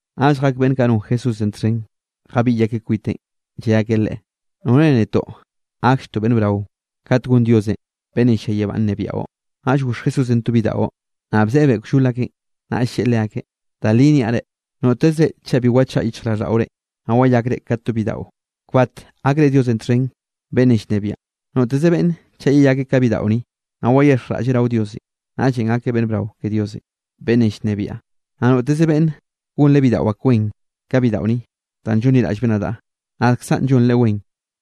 Naꞌll jak beꞌnn kaꞌ non Jesúsenꞌ txhen jabiꞌy akeꞌ kwiteꞌn, lle akeꞌ Leꞌe: —¿Nore netoꞌ gaklltoꞌ beꞌnn brao kat gon Dios beꞌnnenꞌ llia yebánꞌ nnebiaꞌo? Naꞌll goxh Jesúsenꞌ to bidaꞌo, naꞌ bzeꞌebeꞌ kllol akeꞌn. Naꞌll lleꞌe leakeꞌ: —Da li niaꞌ reꞌ, notezre chaꞌ bi wchaꞌa yichjraꞌlldaꞌore, naꞌ wayakre ka to bidaꞌo, kbat gakre Diosenꞌ txhen beꞌnnenꞌ llnebiaꞌn. Noteze beꞌnne chaꞌ yeyakeꞌ ka bidaꞌo ni, naꞌ waxhexjraꞌlleꞌ rao Diosenꞌ, naꞌllenꞌ gakeꞌ beꞌnn brao ke Diosenꞌ beꞌnnenꞌ llnebiaꞌ. Naꞌ noteze beꞌnne gonreꞌ bidaꞌo ak wen ka bidaꞌo ni, danꞌ llonliraꞌllbeꞌ nadaꞌ, nadkzaꞌn llonreꞌ wen.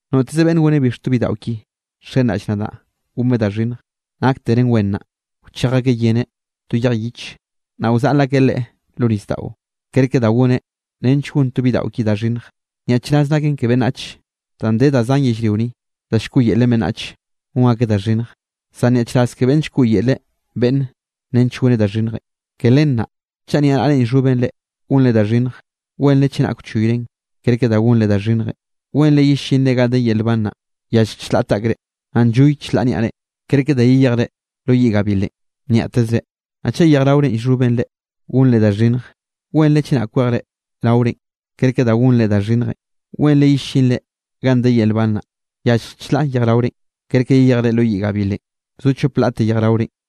’Noteze beꞌnne goneꞌ bix to bidaꞌo ki nxenraꞌll nadaꞌ gonbeꞌ da xhinnj, nakteren wen naꞌ, wchej akeꞌ yeneꞌ to yej yiche, naꞌ wzaꞌl akeꞌ leꞌe lo nisdaꞌo, kerke da goneꞌ nench gon to bidaꞌo ki da xhinnj. Nyaꞌchraz naken ke beꞌnnach danꞌ de da zan yellrio ni, da llkoꞌyelen beꞌnnachenꞌ gon akeꞌ da xhinnj, zan nyaꞌchraz ke beꞌnn llkoꞌyeleꞌ beꞌnne nench goneꞌ da xhinnje. ’Ke len naꞌ, chaꞌ niaꞌnaꞌrenꞌ llxhoben reꞌ, gonre da xhinnj, wenre chenak wchoyren, kerke da gonre da xhinnjenꞌ. Wenre yellinre ganꞌ de yel nban naꞌ, yallje chlaꞌ taꞌkre, naꞌ nlloy chlaꞌ niaꞌre, kerke da yeyejre lo yiꞌ gabilenꞌ nyaꞌtezre. Naꞌ chaꞌ yejraorenꞌ llxhoben reꞌ, gonre da xhinnj, wenre chenak kwejre raorenꞌ kerke da gonre da xhinnjenꞌ. Wenre yellinre ganꞌ de yel nban naꞌ, yallje chlaꞌ yejraorenꞌ, kerke yeyejre lo yiꞌ gabilenꞌ zo chop laꞌte yejraorenꞌ.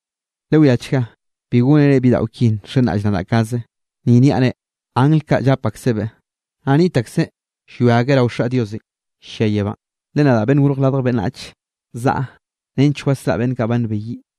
’Lewiachga bi gónere bidaꞌo ki nxenraꞌll nadaꞌ kaze. Ni niaꞌ reꞌ, angl kaꞌ llap aksebeꞌ, naꞌ niꞌt akseꞌ llwia akeꞌ rao Xaꞌ Diosenꞌ llia yebánꞌ. Le nadaꞌ Beꞌnn Gorj Radj Beꞌnnach, zaꞌa nench wasraꞌa beꞌnn kaꞌ ba nbeyiꞌ.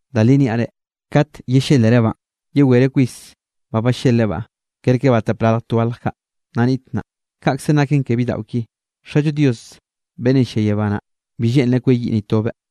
Da li niaꞌ re, kat yellélerebaꞌn, yewereꞌ kwis ba ballelebaꞌ, kerke ba tapralj twalj kaꞌ, nna niꞌt naꞌ. Kaꞌkzenꞌ naken ke bidaꞌo ki. Xallo Dios beꞌnnenꞌ llia yebá naꞌ, bi lleꞌnreꞌ kweyiꞌ ni tobeꞌ.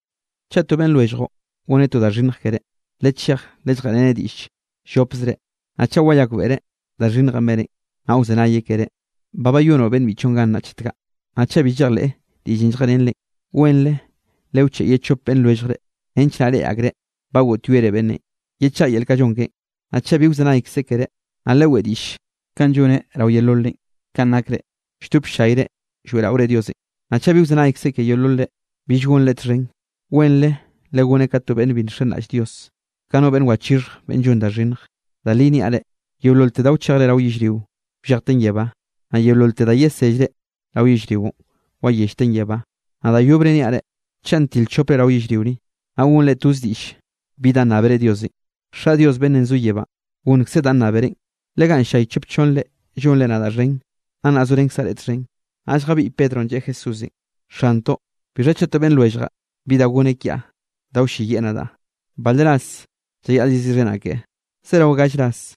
’Chaꞌ to beꞌnn lwelljre goneꞌ to da xhinnj keré, lechej lelljeꞌreneꞌ diꞌll llopzre. Naꞌ chaꞌ wayakbeꞌreꞌ da xhinnjenꞌ beneꞌ, naꞌ wzenayeꞌ keré, ba bayonoꞌ beꞌnn biꞌchoꞌn gan naꞌ, chet kaꞌ. Naꞌ chaꞌ bi llejleꞌ diꞌllenꞌ lljeꞌrenreꞌn, wenre lewcheꞌe ye to chop beꞌnn lwelljre nench naꞌ reꞌe akreꞌ ba goꞌtyoere beꞌnnenꞌ yechaꞌa yel kanꞌ llon keꞌen. Naꞌ chaꞌ bi wzenaykzeꞌ keré, naꞌ leweꞌe diꞌll kanꞌ lloneꞌn rao yeololre kanꞌ nakre lldop ll-llayre lloeꞌraore Diosenꞌ. Naꞌ chaꞌ bi wzenaykzeꞌ ke yeololre, bill gonreꞌ txhen. Wenre legoneꞌ ka to beꞌnn bi nxenraꞌll Dios, ka no beꞌnn wachixhje beꞌnn llon da xhinnj. ’Da li niaꞌ reꞌ, yeololte da wchejre rao yellrio, wllejten yebá, naꞌ yeololte da yesellre rao yellrionꞌ, wayellten yebá. ’Naꞌ da yobre niaꞌ reꞌ, chaꞌ ntil chopre rao yellrio ni, naꞌ gonre toze diꞌll bi danꞌ nnábere Diosenꞌ, Xaꞌ Dios beꞌnnenꞌ zo yebánꞌ gonnkzeꞌ danꞌ nnáberenꞌ. Le ganꞌ nllay chop chonnre llonre nadaꞌ xhen, gannaꞌ zorenkzaꞌ reꞌ txhen. Naꞌll jabiꞌy Pedronꞌ lleꞌe Jesúsenꞌ: —Xantoꞌ, bixha chaꞌ to beꞌnn lwelljaꞌ bi da goneꞌ kiaꞌ da wlleyiꞌ nadaꞌ, ¿bale ras llayaꞌl yeziꞌxhenaꞌ keꞌe? ¿Zerao gall ras?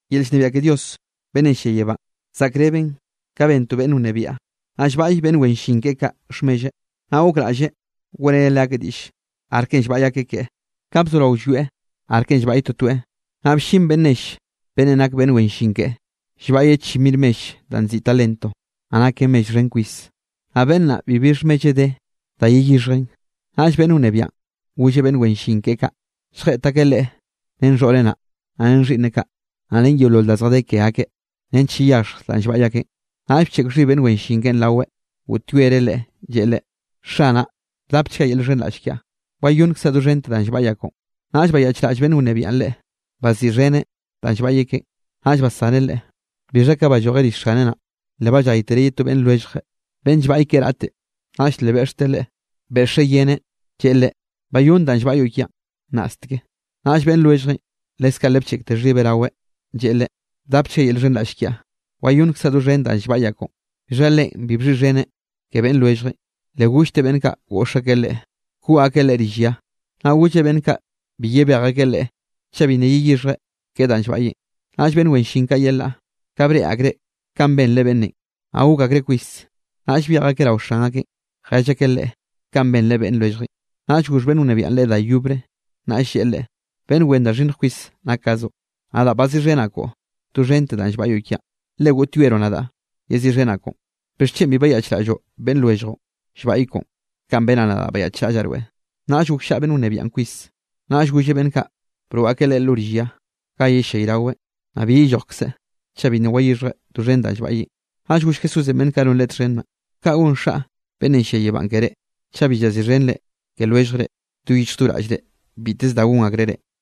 ’Yel llnebiaꞌ ke Dios beꞌnnenꞌ llia yebánꞌ zaꞌkreben ka ben to beꞌnn wnebiaꞌ, naꞌ llbaꞌy beꞌnn wen llin keꞌe kaꞌ xhmelleꞌ, naꞌ gokraꞌlleꞌ weꞌreneꞌ leakeꞌ diꞌll arkenꞌ llbaꞌy akeꞌ keꞌe. Ka bzorao llwieꞌ arkenꞌ llbaꞌy totoeꞌ, naꞌ bllin beꞌnn nell beꞌnnenꞌ nak beꞌnn wen llin keꞌen llbaꞌyeꞌ chi mir mell danꞌ nziꞌi talento, naꞌ naken mell xhen kwis. Naꞌ beꞌnn naꞌ bibi xhmelleꞌ de da yeyixhjeꞌn. Naꞌll beꞌnn wnebiaꞌn golleꞌ beꞌnn wen llin keꞌe kaꞌ lljeꞌt akeꞌ leꞌe ren xhoꞌreꞌ naꞌ, naꞌ ren xhiꞌnneꞌ kaꞌ, naꞌ ren yeolol da zjadé ke akeꞌ nench yeyaxhj danꞌ llbaꞌy akeꞌn. Naꞌll bcheꞌk xhib beꞌnn wen llin keꞌen raweꞌ, goꞌtyoereꞌ leꞌe lleꞌe leꞌe: “Xanaꞌ, bdapchga yel llxhenraꞌll kiaꞌ, wayonnkzaꞌ doxhente danꞌ llbaꞌyaꞌ koꞌon.” Naꞌll bayaꞌchraꞌll beꞌnn wnebiaꞌn leꞌe, baziꞌxheneꞌ danꞌ llbaꞌyeꞌ keꞌen, naꞌll bsaneꞌ leꞌe. Bixha ka ballojeꞌ rill xaneꞌ naꞌ, le balláytereꞌ ye to beꞌnn lwelljeꞌ, beꞌnn llbaꞌy keꞌe raꞌte. Naꞌll le beꞌxteꞌ leꞌe, beꞌxeꞌ yeneꞌ, lleꞌe leꞌe: “Bayónn danꞌ llbaꞌyoꞌ kiaꞌn nnaꞌsteke.” Naꞌll beꞌnn lwelljeꞌn leskaꞌ le bcheꞌkte xhibeꞌ raweꞌ, lleꞌe leꞌe: “Bdapchga yel llxhenraꞌll kiaꞌ, wayonnkzaꞌ doxhen danꞌ llbaꞌyaꞌ koꞌon.” Bixha leꞌen bi bxhiꞌxheneꞌ ke beꞌnn lwelljeꞌn, le gollteꞌ beꞌnn kaꞌ goꞌx akeꞌ leꞌe koꞌ akeꞌ leꞌe rill ya, naꞌ golleꞌ beꞌnn kaꞌ bi yebej akeꞌ leꞌe chaꞌ bi nna yeyixhjeꞌ keꞌen danꞌ llbaꞌyeꞌn. Naꞌll beꞌnn wen llin kaꞌ yelaꞌ, ka breꞌe akreꞌ kanꞌ benreꞌ beꞌnnenꞌ, naꞌ gok akreꞌ kwis. Naꞌll byej akeꞌ rao xan akeꞌn, jell akeꞌ leꞌe kanꞌ benreꞌ beꞌnn lwelljeꞌn. Naꞌll goxh beꞌnn wnebiaꞌn leꞌe da yobre, naꞌll lleꞌe leꞌe: “¡Beꞌnn wen da xhinnj kwis nakkazoꞌ! Nadaꞌ baziꞌxhenaꞌ koꞌo doxhente danꞌ llbaꞌyoꞌ kiaꞌn, le goꞌtyoeroꞌ nadaꞌ yeziꞌxhenaꞌn koꞌon. ¿Bixchen bi bayaꞌchraꞌlloꞌ beꞌnn lwelljoꞌn llbaꞌy koꞌon kanꞌ benaꞌ nadaꞌ bayaꞌchraꞌllaꞌ rweꞌ?” Naꞌll gokllaꞌa beꞌnn wnebiaꞌn kwis, naꞌll golleꞌ beꞌnn kaꞌ broꞌ akeꞌ leꞌe lo rill ya ga yellayraweꞌ, naꞌ bi yellojkzeꞌ chaꞌ bi nna wayixhjeꞌ doxhen danꞌ llbaꞌyeꞌn. Naꞌll goll Jesúsenꞌ beꞌnn kaꞌ non Leꞌe txhen naꞌ: —Kanꞌ gon Xaꞌ beꞌnnenꞌ llia yebánꞌ keré, chaꞌ bi llaziꞌxhenre ke lwelljre do yichj do raꞌllre biteze da gon akreꞌ reꞌ.